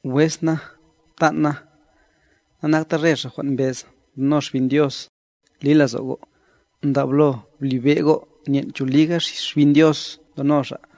Wes na', ptan' na, nanakta re xa' jwan' mbez ndono Xbin Dios, li lazo' go', ndablo blibe' go' nyen' cho liga Xbin Dios ndono xa'.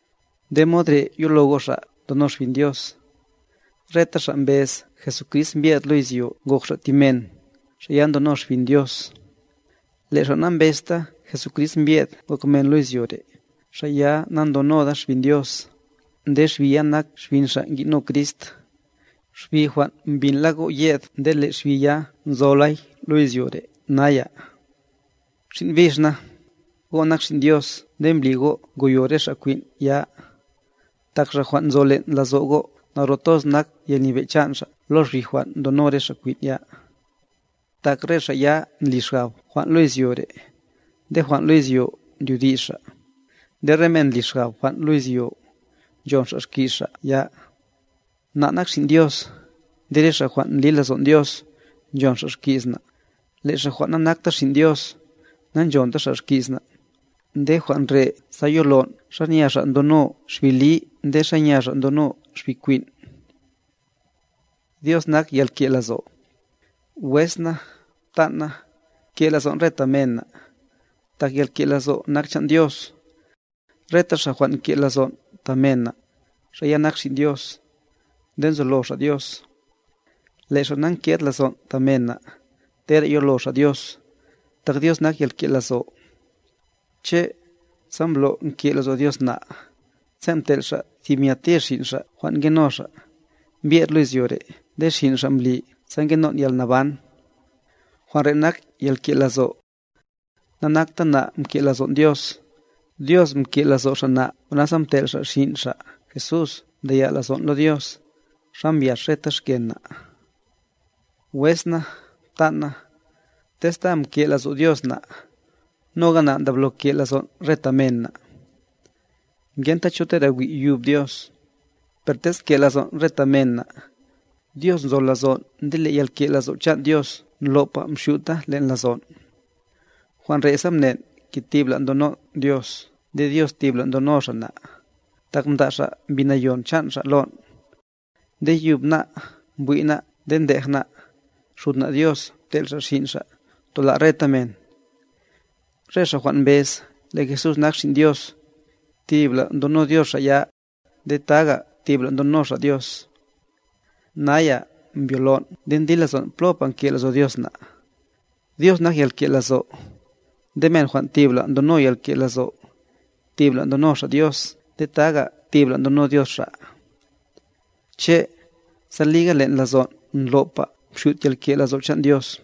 Nde mod re' yolo go' xa' ndono Xbin Dios. Reta xa' mbez Jesucrist mbyed lo izyo ngok Xa' ti men, xa' ya ndono Xbin Dios. Le' xa' nambezta Jesucrist mbye'd ngok men lo izyo re', xa' ya nandonoda xbin Dios, nde xbi ya nak xbin xa' ngino Crist, xbi jwan' mbinla go' yed nde le' xbi ya nzolay lo izyo re' naya. Xin' bix na, go' nak xin' Dios nde mbli go' ngoyo re xa' kwin' ya, tak Xa' jwan' nzo len' lazo' go' naro toz nak yalnyebe' chan' Xa' lo xbi jwan ndono re xa' kwin' ya. Tak re xa' ya ndli xgab jwan' lo izyo re', nde jwan' lo izyo ndyodi's xa', nde re men ndli xgab jwan' lo izyo, nchon xa' xki's xa' ya. Na' nak xin' Dios, nde re xa' jwan' ndli lazon' Dios, nchon xa' xki's na', le' xa' jwan' na'nakta xin' Dios, na'nchonta xa' xki's na', nde jwan' re' sa yolon' xanya xa' ndono Xbi li nde xanya xa' ndono xbi kwin'. Dios nak yalke' lazo' Wes na, ptan' na, ke' lazon' re ta men na', tak yalke' lazo' nak chan' Dios. Reta xa' jwan' nke' lazon' ta mena, xa' ya nak xin' Dios, nde nzolo xa' Dios. Le' xa' na'nked lazon' ta men na', tera yolo xa' Dios, tak Dios nak yalke' lazo'. Che', sa mblo' nke' lazo' Dios na', sen' mtel' Xa' thib nya tir Xin' Xa' jwan' ngeno Xa', mbyed lo izyo re' nde Xin' Xa' mbli sa ngenon' yalnaban. Jwan' re' nak yalke' lazo': Na'nakte na' mke' lazon' Dios, Dios mke' lazo' Xa' na' jwan' nasa mtel' Xa' Xin' Xa' Jesús mdaya' lazon' lo Dios, sa mbyax reta xken' na'. Wes na, ptan' na, tez ta mke' lazo' Dios na', noga na' ndablo ke' lazon' re ta men na'. Ngenta cho tera wi' yub Dios, per tez nke' lazon' re ta men na', Dios nzo lazon' nde le' yalke' lazo' chan' Dios ndlo'pa mxyuta len' lazon'. Jwan' re' sa mnen' ke tibla' ndonon' Dios nde Dios tibla' ndono Xa' na', tak mda' Xa' Mbi Nayon chan' Xa' lon'. Nde yub ná' mbwi' ná' nde ndej ná', Xud na' Dios mtel' Xa' Xin' Xa', tola' reta men. Re xa' jwan' mbez le' Jesús nak Xin' Dios, tibla' ndono Dios xa' ya, nde taga tibla' ndono xa' Dios. Naya mbyolon' nde ndli lazon' plopa nke' lazo' Dios na'. Dios nak yalke' lazo', nde men jwan' tibla' ndono yalke' lazo', tibla' ndono xa' Dios nde taga tibla' ndono Dios xa'. Che', sa liga len' lazon' ndlo'pa mxyut yalke' lazo' chan' Dios,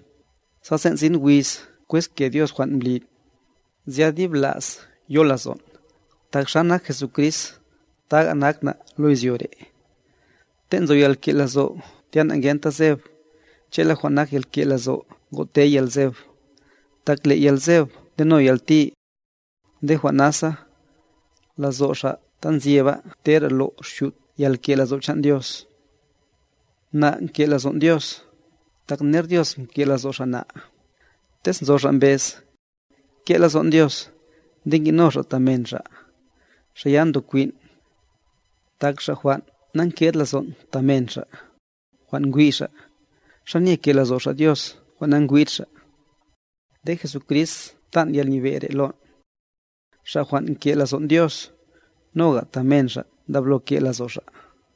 sa sen' sin wiz kwezke Dios jwan' mblin', zya dib la's yo lazon', tak xa nak Jesucrist, taga nak na' lo izyo re'. Ten' nzo yalke' lazo' tya na'ngenta zeb, che'la jwan' nak yalke' lazo' ngotey yalzeb, tak le' yalzeb ndeno yalti. Nde jwan' nasa, lazo' xa' ta nzyeba tera lo' xyut yalke' lazo' chan' Dios. Na' nke' lazon' Dios, tak ner Dios mke' lazo' Xa' na' Tez nzo xa' mbez: Nke' lazo'n Dios, nde ngi'no xa' ta men xa', xa' ya ndokwin'. Tak xa' jwan' na'nked lazon' ta men xa', jwan' ngwi' xa', ¿xa nye ke' lazo' xa' Dios jwan' na'ngwid xa'? Nde Jesucrist mtan' yalnyebe' re' lon': Xa' jwan' nke' lazon' Dios, noga ta men xa' ndablo ke' lazo' xa'.